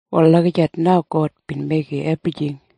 Wal lagijat na God bin meigim ebrijing.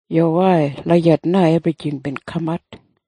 Yuwai. Lagijat na ebrijing bin kamat.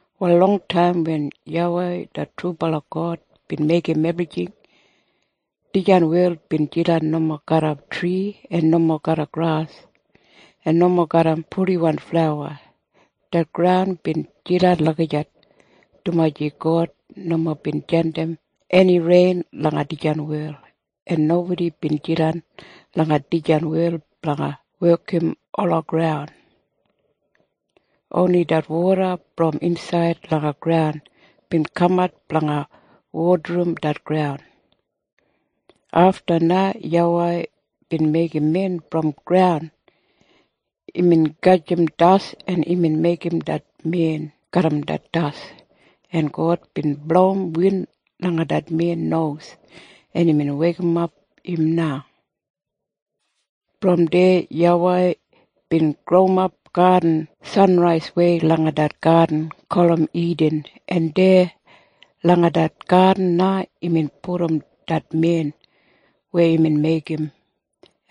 Wal longtaim wen YAWEI det trubala God bin meigim ebrijing, dijan wel bin jidan nomo garram tri en nomo garram gras en nomo garram purdiflawa. Det graun bin jidan lagijat dumaji God nomo bin jandim eni rein langa dijan wel, en nobodi bin jidan langa dijan wel blanga wekim ola graun. Oni det woda brom insaid langa graun bin kamat blanga wodarim det graun. Afta na YAWEI bin meigim men brom graun. Imbin gajim das, en imbin meigim det men garram det das, en God bin blowim win langa det men nos, en imbin weikimap im na. Brom deya YAWEI bin growimap gadin sanraiswei langa det gadin gulum Idin, en deya langa det gadin na imbin pudum det men weya imbin meigim.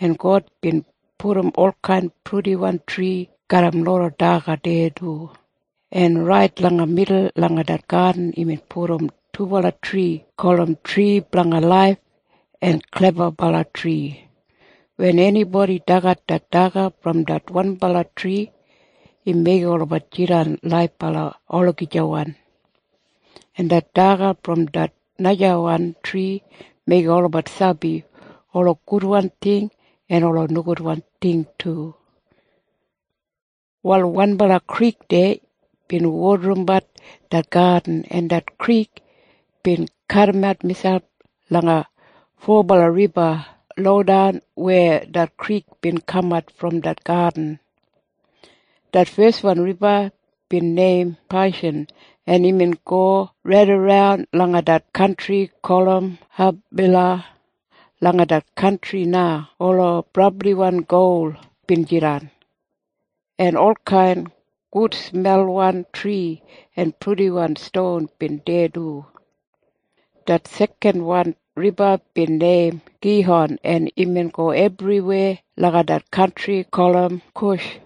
En God bin pudum olkain purdiwan tri garram loda daga deya du, en rait langa midul langa det gadin imbin pudum dubala tri gulum Tri Blanga Laif en Klebabala Tri. Wen enibodi dagat det daga brom det wanbala tri, im meigim olabat jidan laibala olagijawan. En det daga brom det najawan tri meigim olabat sabi ola gudwan ting en ola nogudwan ting du. Wal wanbala krik deya bin wodarimbat det gadin, en det krik bin kadimat miselp langa fobala riba lodan weya det krik bin kamat brom det gadin. Det feswan riba bin neim Paishan, en imbin go raidaran langa det kantri gulum Habila. Langa det kantri na ola brabliwan gol bin jidan, en olkain gudsmelwan tri en purdiwan ston bin deya du. Det sekanwan riba bin neim Gihon, en imbin go ebriweya langa det kantri gulum Kush.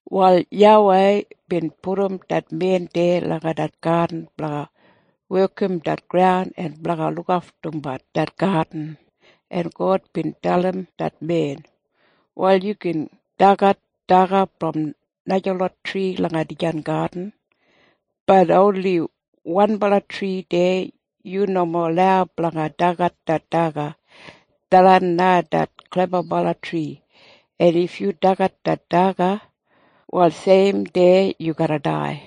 Wal YAWEI bin pudum det men deya langa det gadin blanga wekim det graun en blanga lukaftumbat det gadin, en God bin dalim det men, “Wal yu gin dagat daga brom najalot tri langa dijan gadin, bat oni wanbala tri deya yu nomo lau blanga dagat det daga. Tharran na det Klebabala Tri. En if yu dagat det daga, wal seim dei yu garra dai.”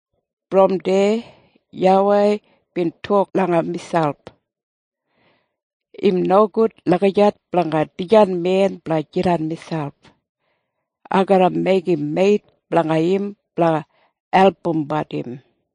Brom deya YAWEI bin tok langa miselp, “Im nogud lagijat blanga dijan men blanga jidan miselp. Ai garra meigim meit blanga im blanga albumbat im.”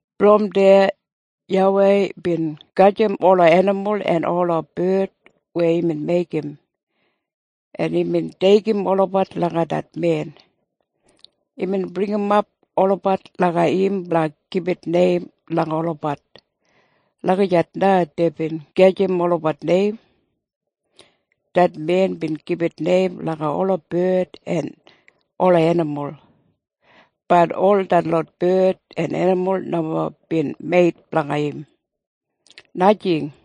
Brom deya YAWEI bin gajim ola enimul en ola bard weya imbin meigim, en imbin deigim olabat langa det men. Imbin bringimap olabat langa im blanga gibit neim langa olabat. Lagijat na deibin gajim olabat neim. Det men bin gibit neim langa ola bard en ola enimul. Bat ol detlot bard en enimul nomo bin meit blanga im. Najing.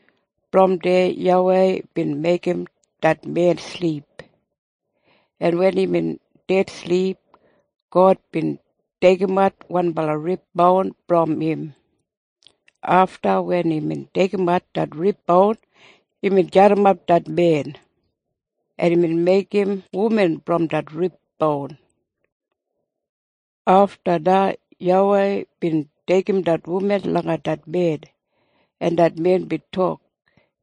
Brom deya YAWEI bin meigim det men silip, en wen imbin dedsilip, God bin deigimat wanbala rib boun brom im. Afta wen imbin deigimat det rib boun, imbin jadimap det men, en imbin meigim wuman brom det rib boun. Afta na YAWEI bin deigim det wuman langa det men, en det men bin tok,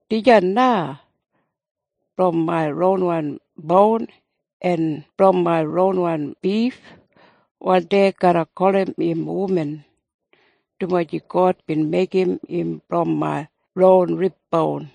“Dijan na! Brom main ronwan boun en brom main ronwan bif. Wal dei garra gulum im wuman, dumaji God bin meigim im brom main ron riboun.”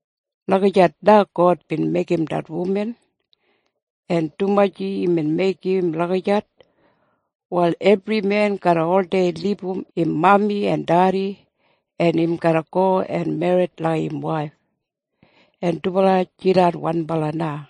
Lagijat na God bin meigim det wuman. En dumaji imbin meigim im lagijat, wal ebri men garra oldei libum im mami en dedi, en im garra go en merrit langa im waif, en dubala jidan wanbala na.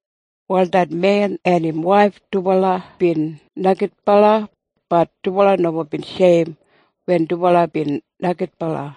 Wal det men en im waif dubala bin neigidbala. Bat dubala nomo bin sheim wen dubala bin neigidbala.